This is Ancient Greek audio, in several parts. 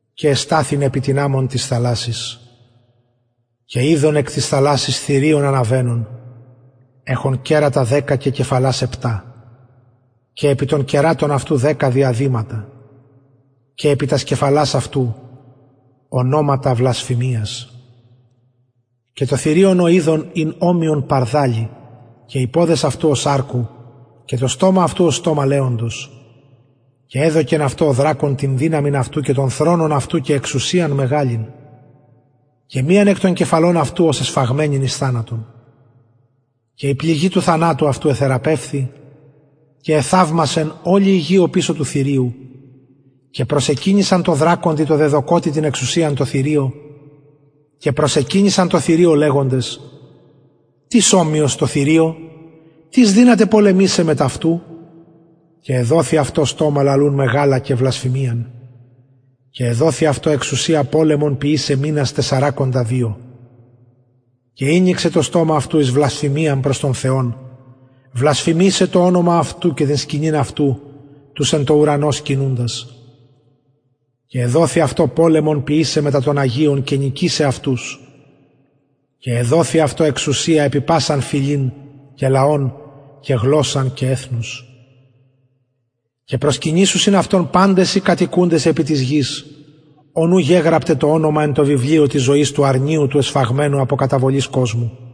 και εσταθην επι την αμμον της θαλασσης και ειδον εκ της θαλασσης θηριον αναβαινον εχον κερατα δεκα και κεφαλας επτα και επι των κερατων αυτου δεκα διαδηματα και επι τας κεφαλας αυτου ονοματα βλασφημιας και το θηριον ο ειδον ην ομοιον παρδαλει και οι ποδες αυτου ως αρκου και το στομα αυτου ως στομα λεοντος και εδωκεν αυτω ο δρακων την δυναμιν αυτου και τον θρονον αυτου και εξουσιαν μεγαλην και μιαν εκ των κεφαλων αυτου ωσει εσφαγμενην εις θανατον και η πληγη του θανατου αυτου εθεραπευθη και εθαυμασεν ολη η γη οπισω του θηριου και προσεκυνησαν τω δρακοντι τω δεδωκοτι την εξουσιαν τω θηριω και προσεκυνησαν τω θηριω λεγοντες τις ομοιος τω θηριω και τις δυνατος πολεμησαι μετ αυτου και εδοθη αυτω στομα λαλουν μεγαλα και βλασφημιαν και εδοθη αυτω εξουσια πολεμον ποιησαι μηνας τεσσαρακοντα δυο και ηνοιξεν το στομα αυτου εις βλασφημιαν προς τον θεον βλασφημησαι το ονομα αυτου και την σκηνην αυτου τους εν τω ουρανω σκηνουντας και εδοθη αυτω ποιησαι πολεμον μετα των αγιων και νικησαι αυτους και εδοθη αυτω εξουσια επι πασαν φυλην και λαον και γλωσσαν και εθνος και προσκυνησουσιν αυτω παντες οι κατοικουντες επι της γης ων ου γεγραπται το ονομα εν τω βιβλιω της ζωης του αρνιου του εσφαγμενου απο καταβολης κοσμου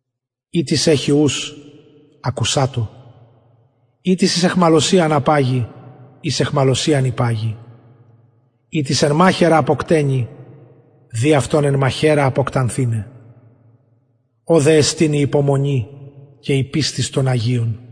ει τις εχει ους ακουσατω ει τις εχει αιχμαλωσιαν υπαγει ει τις εν μαχαιρα αποκτενει δει αυτον εν μαχαιρα αποκτανθηναι ωδε εστιν η υπομονη και η πιστις των αγιων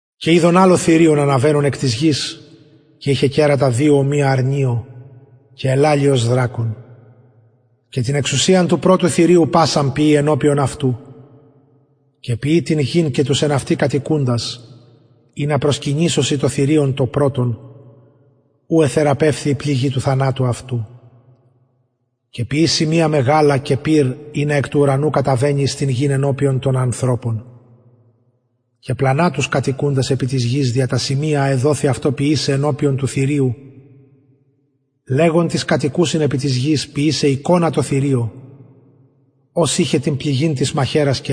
και ειδον αλλο θηριον αναβαινον εκ της γης και ειχεν κερατα δυο ομοια αρνιω και ελαλει ως δρακων και την εξουσιαν του πρωτου θηριου πασαν ποιει ενωπιον αυτου και εποιει την γην και τους εν αυτη κατοικουντας ινα προσκυνησωσιν το θηριον το πρωτον ου εθεραπευθη η πληγη του θανατου αυτου και ποιει σημεια μεγαλα και πυρ ινα εκ του ουρανου καταβαινη επι την γην ενωπιον των ανθρωπων και πλανα τους εμους τους κατοικουντας επι της γης δια τα σημεια α εδοθη αυτω ποιησαι ενωπιον του θηριου λεγων τοις κατοικουσιν επι της γης ποιησαι εικονα τω θηριω ο ειχεν την πληγην και εζησεν απο της μαχαιρας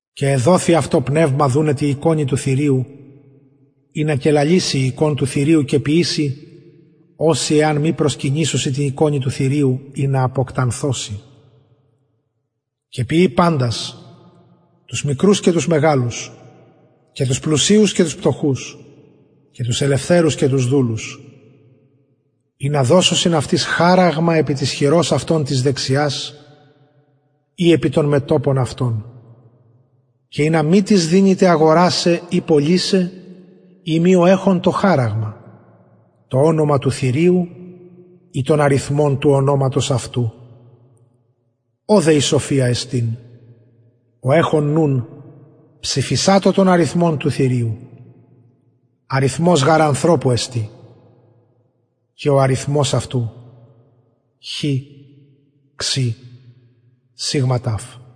και εδοθη αυτω πνευμα δουναι τη εικονι του θηριου ινα και λαληση η εικων του θηριου και ποιηση οσοι εαν μη προσκυνησωσιν τη εικονι του θηριου αποκτανθωσιν και ποιει παντας τους μικρους και τους μεγαλους και τους πλουσιους και τους πτωχους και τους ελευθερους και τους δουλους ινα δωσωσιν αυτοις χαραγματα επι της χειρος αυτων της δεξιας η επι το μετωπον αυτων και ινα μη τις δυναται αγορασαι η πωλησαι ει μη ο εχων το χαραγμα το ονομα του θηριου η τον αριθμον του ονοματος αυτου ωδε η σοφια εστιν ο εχων νουν ψηφισατω τον αριθμον του θηριου αριθμος γαρ ανθρωπου εστιν και ο αριθμος αυτου εστιν εξακοσια εξηκοντα εξ